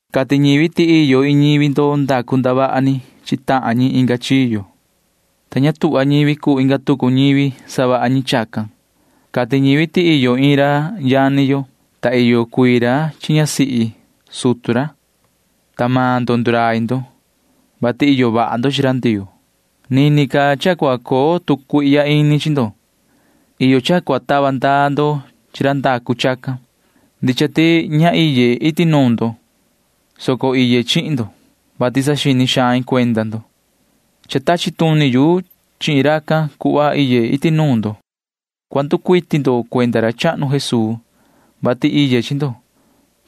Cati ñivi ti iyo iin ñivi ndo ndacu ndavaha ni chi tahan ñi inga chiyo, ta ña tuhva ñivi cuu inga tucu ñivi savaha ñi chacan. Cati ñivi ti iyo iin ra yani yo, ta iyo cuii ra chi ñasihi sutu ra, ta maan ndo ndurai ndo, vati iyo vaha ndo chi ra Ndioo. Nini ca cha cua coo tu cuihya ini chi ndo. Iyo cha cua tava ndaa ndo chi ra ndacu chacan. Ndicha ti ña iye iti nuun ndo, soco iye chihin ndo, vati saxini xain cuenda ndo. Cha tachi tuni yu chihin racan cuhva iye iti nuun ndo. Cua nducuiti ndo cuenda ra chahnu Jesuu, vati iye chi ndo.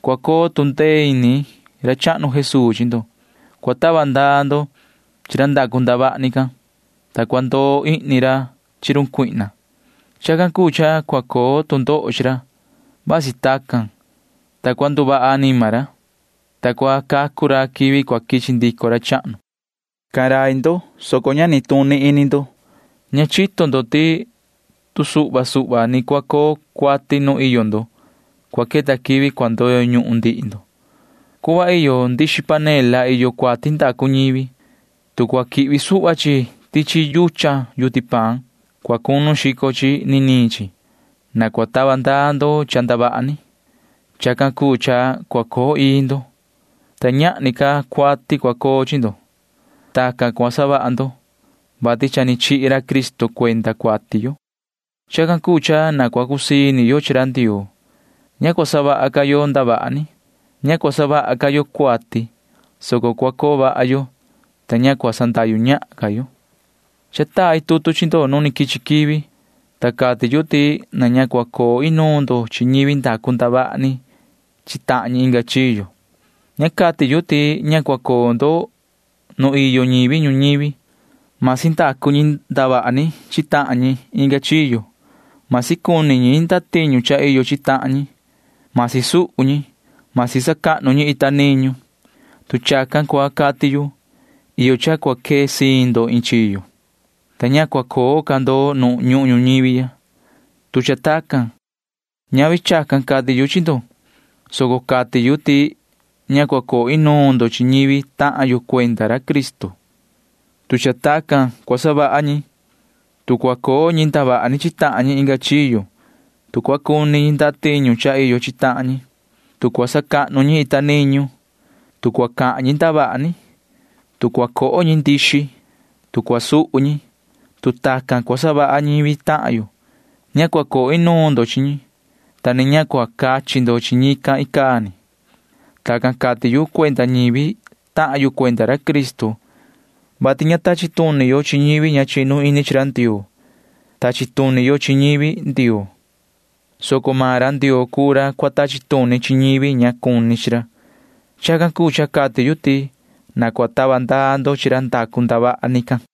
Cua coo tu ndee ini ra chahnu Jesuu chi ndo. Cua tava ndaa ndo chi ra ndacu ndavaha ni can, ta cua ndoo ihni ra chi run Satanaa. Chacan cuu cha cua coo tu ndoho chi ra. Vasi tacan, ta cua nduvaha anima ra, ta cua cacu ra quivi cua quichi ndico ra chahnu. Cahan rai ndo, soco ña nituni ini ndo. Ña chito ndo ti tu suhva suhva ni cua coo cuati nu iyo ndo, cua queta quivi cua ndoyo ñuhun ndihi ndo. Cuhva iyo ndixi panela iyo cuati ndacu ñivi. Tu cua quihvi suhva chi tichi yuchan yuti paan, cua cunu xico chi niniin chi. Na cua tava ndaa ndo cha ndavaha ni. Chacan cuu cha cua coo ii ndo, ta ñahni ca cuati cua coo chi ndo. Tacan cua savaha ndo, vati cha ni chihi ra Cristo cuenda cuati yo. Chacan cuu cha na cua cusii ini yo chi ra Ndioo. Ña cua savaha ca yo ndavaha ni. Ña cua savaha ca yo cuati, soco cua coo vaha yo, ta ña cua sandahyu ñahan ca yo. Cha tai tutu chi ndo nu ni quichi quivi, ta cati yu ti na ña cua coo inuun ndo chi ñivi ndacu ndavaha ni chi tahan ñi inga chiyo. Ña cati yu ti ña cua coo ndo nu iyo ñivi ñuñivi, masi ndacu ñi ndavaha ni chi tahan ñi inga chiyo, masi cuni ñi ndatiñu cha iyo chi tahan ñi, masi suhu ñi, masi sacahnu ñi ita niñu. Tu chacan cua cati yu, iyo cha cua quee siin ndo iin chiyo, ta ña cua coo ca ndo nu ñuhun ñuñivi ya, tu cha tacan. Ñavi chacan cati yu chi ndo, soco cati yu ti ña cua coo inuun ndo chi ñivi tahan yo cuenda ra Cristo, tu cha tacan cua savaha ñi. Tu cua coo ñi ndavaha ni chi tahan ñi inga chiyo, tu cua cuni ñi ndatiñu cha iyo chi tahan ñi, tu cua sacahnu ñi ita niñu, tu cua cahan ñi ndavaha ni, tu cua coho ñi ndixi, tu cua suhu ñi, tu tacan cua savaha ñivi tahan yo, ña cua coo inuun ndo chi ñi, ta ni ña cua cachi ndo chi ñi icaa ni. Tacan cati yu cuenda ñivi tahan yo cuenda ra Cristo, vati ña tachi tuni yo chi ñivi ña chinu ini chi ra Ndioo. Tachi tuni yo chi ñivi Ndioo, soco maan ra Ndioo cuu ra cua tachi tuni chi ñivi ña cuni chi ra. [Chacan cuu cha cati yu ti] na cua tava ndaa ndo chi ra ndacu ndavaha ni can.